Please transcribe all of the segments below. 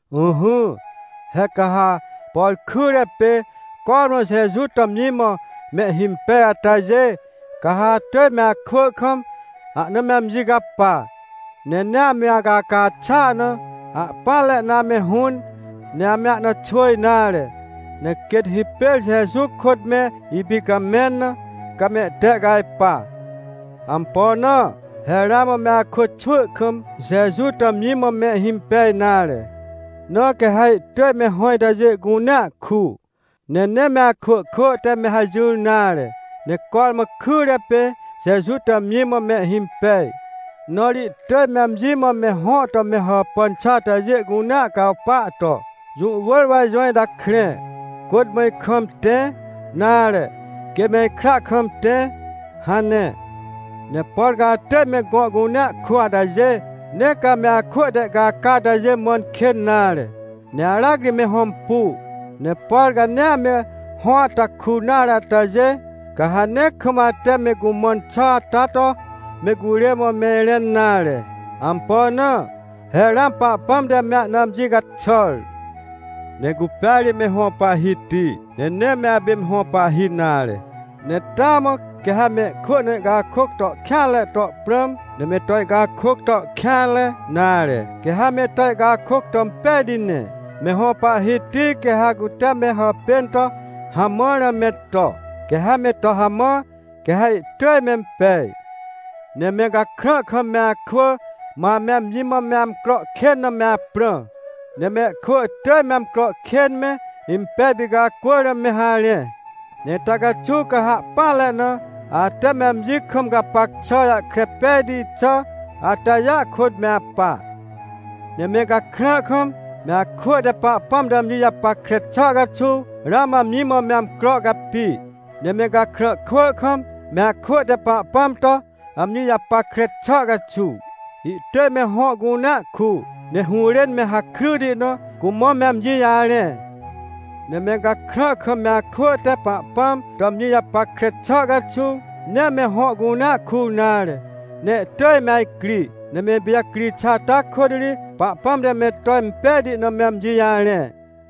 Ỹhỹ, he ca ha, por kyre pê cormã Jeju to amji mã mehhimpej atajê, ca ha atỳj me akwỳ kam, ahna me amji capa. Ne nee ame acaca xàa na, ahpỹanre na ame hũn, ne ame ahna xwỳ nare, ne quêt hipêr Jeju kôt me ipicamẽn na, ca mehtehcajpa. Ampo na? He ramã me akwỳ xwỳ kam Jeju to amji mã mehhimpej nare, na quê ha ihtỳj me hõ itajê cunea ku. Ne nee me akwỳ kwỳ te me hajỹr nare, ne cormã kyre pê Jeju to amji mã mehhimpej. Na ri ihtỳj me amji mã me hõ to me hàpàn xà atajê cunea cawpa to: — Jũ wỳr wa ijõ ita krẽ, kôt mã ikam tẽ, nare, quê me ikra kam tẽ — hane. Ne por ca atỳj me gõ cunea ku atajê, nee ca ame akwỳ te ihcaca catêjê mãn kên nare, ne aracri me hõmpu. Ne por ca nee ame hõ ata kur nare atajê, ca ha nee kam ate me cumãn xà ata to me curê mã me irẽn nare. Ampo na? He ramã Pahpãm te me ahna amji caxàr. Ne cupêa ri me hõ Pahhiti, ne nee me apê me hõ pahhi nare. Ne taa mã quê ha mehkwỳ na ihcakôc to kêanre to prãm, ne me to ihcakôc to kêanre, nare, quê ha me to ihcakôc to impejti ne. Me hõ Pahhiti quê ha cute me hàpên to hamãr na me to, quê ha me to hamã, quê ha ihtỳj mempej. Ne me gakrã kam me akwỳ, ma ame amji mã me amcro kên na me aprã. Ne mehkwỳ ihtỳj me amcro kên me, impej picacwỳr na me harẽ. Ne ita caxuw ca ha ahpỹanre na, ate me amji kam gapac xà jahkre pejti xà atajêa kôt me apa. Ne me gakrã kam, me akwỳ te Pahpãm to amji japackre xà caxuw, ramã amji mã me amcro capi. Ne me gakrã kwỳ kam, me akwỳ te Pahpãm to amji japackre xà caxuw, ihtỳj me hõ cunea ku, ne hũrên me hakryti na, cumã me amji jarẽ. Ne me gakrã kam me akwỳ te Pahpãm to amji japackre xà caxuw, nee me hõ cunea kur nare, ne ihtỳj me ajcri. Ne me ipijacri xà ata kôt ri Pahpãm te me to impejti na me amji jarẽ.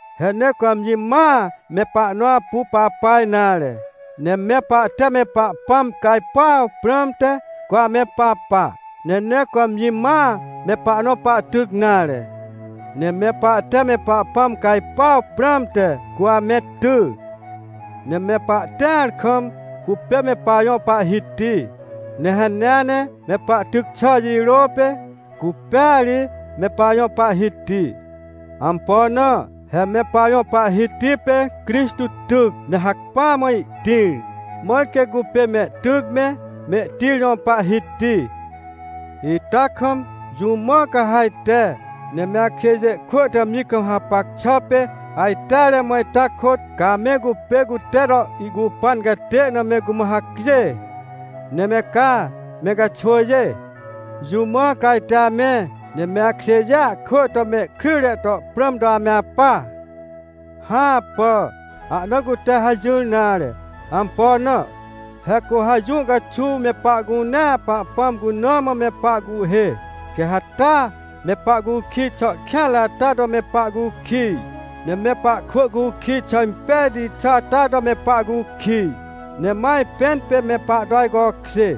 He nee cu amji mãa, me pahnõ apu papa nare. Ne me pahte me Pahpãm cajpuaw prãmte, cu ame papa. Ne nee cu amji mãa me pahnõ pahtyc nare. Ne me pahte me Pahpãm cajpuaw prãmte, cu ame ty. Ne me pahtĩar kam cupê me pajõ Pahhiti, ne hanea ne me pahtyc xà jirô pê, cupêa ri me pajõ Pahhiti. Ampo na? He me pajõ Pahhiti pê Crixtô tyc, ne hacpỹa mã ihtĩr, mãr quê cupê mehtyc me, mehtĩr jõ Pahhiti. Ita kam, jũ mã ca ha ajte, ne me akjêjê kwỳ te amji kam hapac xà pê ajteare mã ita kôt, ca ame cupê cute to ihcupan catê na me cumã hacjê? Ne me ca, me ca xwỳjê? Jũ mã ca ajte ame, ne me akjêjêa kwỳ to mehkryjre to prãm to ame apa? Hãpà! Ahna cute hajỹr nare! Ampo na? He cu ha jũ caxuw me pahcunea Pahpãm cuna mã me pahcuhhê, quê ha taa me pahcukij xà kêanre ata to me pahcukij, ne me pahkwỳ cukij xà impejti xà ata to me pahcukij, ne ma ajpẽn pê me pahto ajcokjê.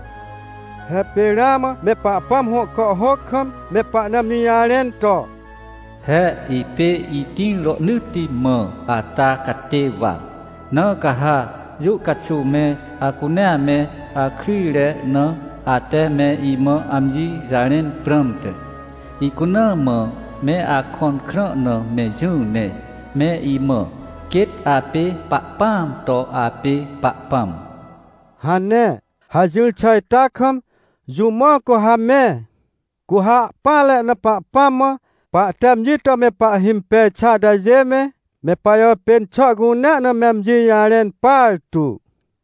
He pê ramã me Pahpãm hõ kàhhôc kam me pahna amji jarẽn to: “He ipê itĩr rohnỳtti mã ata catê wa, na ca ha jũ caxuw me acunea me akryjre na ate me imã amji jarẽn prãmte, icuna mã me akõn krã na me jỹ, ne me imã: ‘Quêt apê Pahpãam to apê Pahpãm’” hane. Hajỹr xà ita kam, jũ mã cu ha me? Cu ha ahpỹanre na Pahpãm mã pahte amji to me pahhimpej xà atajê me, me pajàpên xà cunea na me amji jarẽn partu.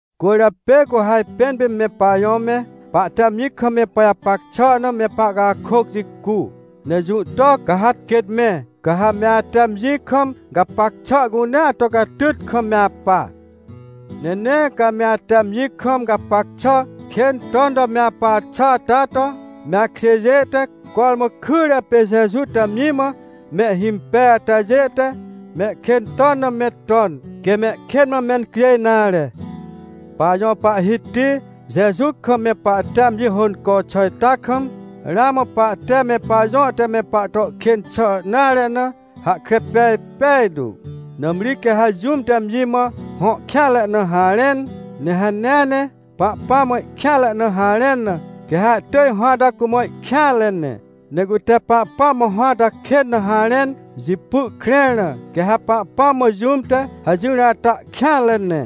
Cwỳrjapê cu ha ajpẽn pê me pajõ me, pahte amji kam me pajapac xà na me pahcakôc jicu. Ne jũ to ca ha quêt me? Ca ha me ate amji kam gapac xà cunea to catyt kam me apa. Ne nee ca me ate amji kam gapac xà kên ton to me apa xà ata to, me akjêjê te cormã kyre pê Jeju to amji mã mehhimpej atajê te mehkên ton na me ton, quê mehkên mã mencjêj nare. Pajõ Pahhiti Jeju kam me pahte amji hônco xà ita kam, ramã pahte me pajõ te me pahto kên xà nare na, hahkre pej pejtu. Nãmri quê ha jũm te amji mã hõ kêanre na harẽn, ne hanea ne Pahpãm mã ihkêanre na harẽn na, quê ha ihtỳj hõ ata cumã ihkêanre ne. Ne cute Pahpãm mã hõ ata kên na harẽn jipy ihkrẽr na, quê ha Pahpãm mã jũm te hajỹr ata kêanre ne.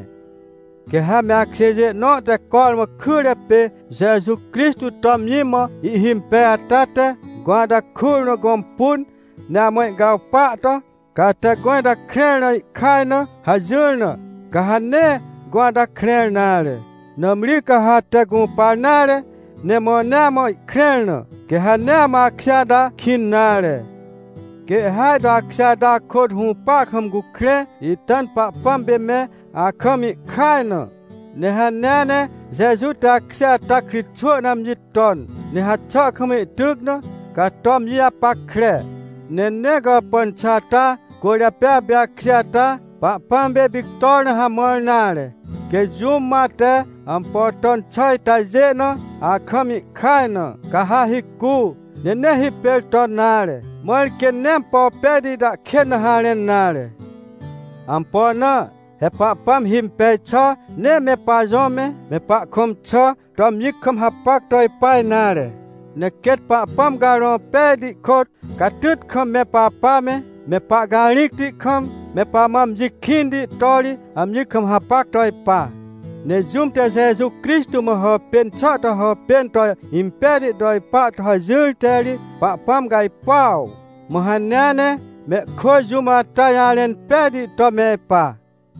Quê ha me akjêjê nõ te cormã kyre pê Jeju Crixtô to amji mã ihhimpej ata te gõ ata kur na gõmpun, ne amã ihcawpa to: — Ca ate gõ ita krẽr na ihkaj na — hajỹr na, ca ha nee gõ ata krẽr nare. Nãmri ca ha ate gũpar nare, ne mãnea mã ihkrẽr na, quê ha nee amã akjê ata kĩn nare. Quê ihhêaj to akjê ata akôt hũpa kam cukrẽ, ita na Pahpãm pê me akam ihkaj na. Ne hanea ne Jeju te akjê ata kritxwỳ na amji ton, ne haxà kam ihtyc na, ca to amji japackre. Ne nee gàpàn xà ata cwỳrjapê apê akjê ata Pahpãm pê ipictor na hamãr nare. Quê jũm mã ate ampo ton xà itajê na akam ihkaj na, ca ha hicu, ne nee hipêr ton nare, mãr quê nee ampo pejti ita kên na harẽn nare. Ampo na? He Pahpãm himpej xà nee me pajõ me, me pahkõm xà to amji kam hapac to ipa nare. Ne quêt Pahpãm Carõ Pejti kôt, catyt kam me papa me, me pahcarĩcti kam, me pamã amji kĩnti to ri amji kam hapac to ipa. Ne jũm te Jeju Crixtô mã hàpên xà to hàpên to impejti to ipa to hajỹr te ri Pahpãm cajpuaw. Mã hanea ne mehkwỳ jũm ata jarẽn pejti to me ipa.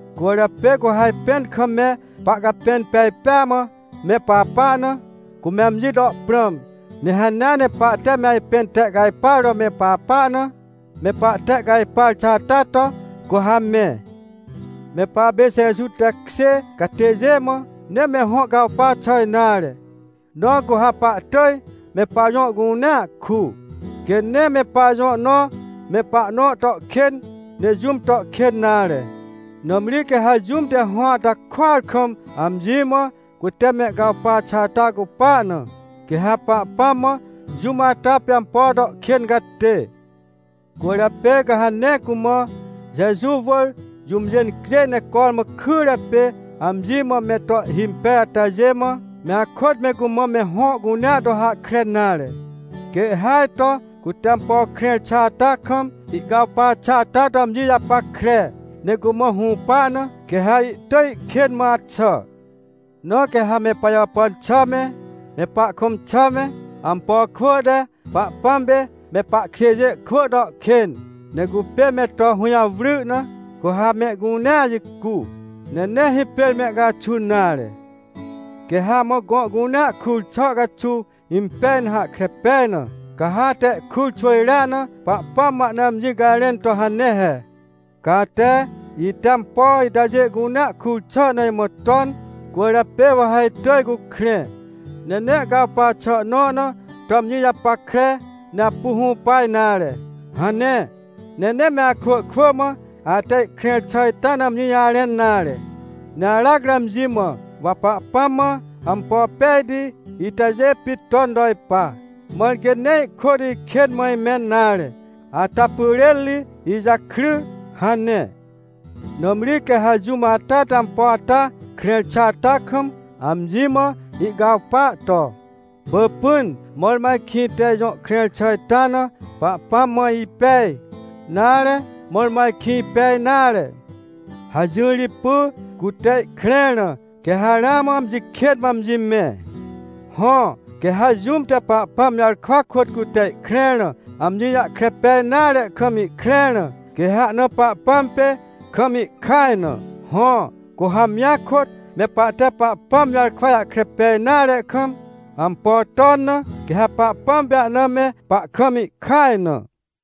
Cwỳrjapê cu ha ajpẽn kam me pahcapẽn pej pêa mã me papa na, cume amji to prãm. Ne hanea ne pahte me ajpẽn tehcajpar to me papa na, me pahtehcajpar xà ata to, cu ha me. Me papê Jeju tekjê catêjê mã, nee me hõ cawpa xà nare. Na cu ha pahtỳj me pajõ cunea ku. Quê nee me pajõ nõ me pahnõ to kên, ne jũm to kên nare. Nãmri quê ha jũm te hõ ata kuar kam amji mã cute mehcawpa xà ata cupa na, quê ha Pahpãm mã jũm ata pê ampo to kên catê. Cwỳrjapê ca ha nee cumã, Jeju wỳr jũmjê incjêj ne cormã kyre pê amji mã me to ihhimpej atajê mã, me akôt me cumã me hõ cunea to hahkre nare. Quê ihhêaj to cute ampo krẽr xà ata kam ihcawpa xà ata to amji japackre, ne cumã hũpa na, quê ha ihtỳj ihkên mã axà. Na quê ha me pajàpàn xà me, me pahkõm xà me, ampo kwỳ te Pahpãm pê me pahkjêjê kwỳ to kên, ne cupê me to hũjawry na, cu ha mehcunea jicu, ne nee hipêr mehcaxun nare. Quê ha amã gõ cunea kur xà caxuw impej na hahkre pej na, ca ha ate ihkur xwỳjrea na Pahpãm mã ahna amji cajrẽn to hane he: — Ca ate, ite ampo itajê cunea kur xà na imã ton, cwỳrjapê wa ha itỳj cukrẽ, ne nee ihcawpa xà nõ na to amji japackre, ne apu hũpa nare — hane. Ne nee me akwỳ kwỳ mã ate ihkrẽr xà ita na amji jarẽn nare. Ne aracri amji mã: — Wa Pahpãm mã ampo pejti itajê pit ton to ipa, mãr quê nee ihkôt ikên mã imẽn nare, ata pyrên ri ijakry — hane. Nãmri quê ha jũm ata te ampo ata krẽr xà ata kam, amji mã ihcawpa to: — Pỳpỹn, mõrmõ ajkĩ ite ijõ krẽr xà ita na Pahpãm mã ipej, nare, mõrmõ ajkĩ ipej nare — hajỹr jipy, cute ihkrẽr na, quê ha ramã amji kên mã amji mẽ. Hõ, quê ha jũm te Pahpãm jarkwa kôt cute ihkrẽr na amji jahkre pej nare kam ihkrẽr na, quê ha ahna Pahpãm pê kam ihkaj na. Hõ, cu ha amjia kôt, me pahte Pahpãm jarkwa jahkre pej nare kam, ampo ton na, quê ha Pahpãm pê ahna me pahkam ihkaj na.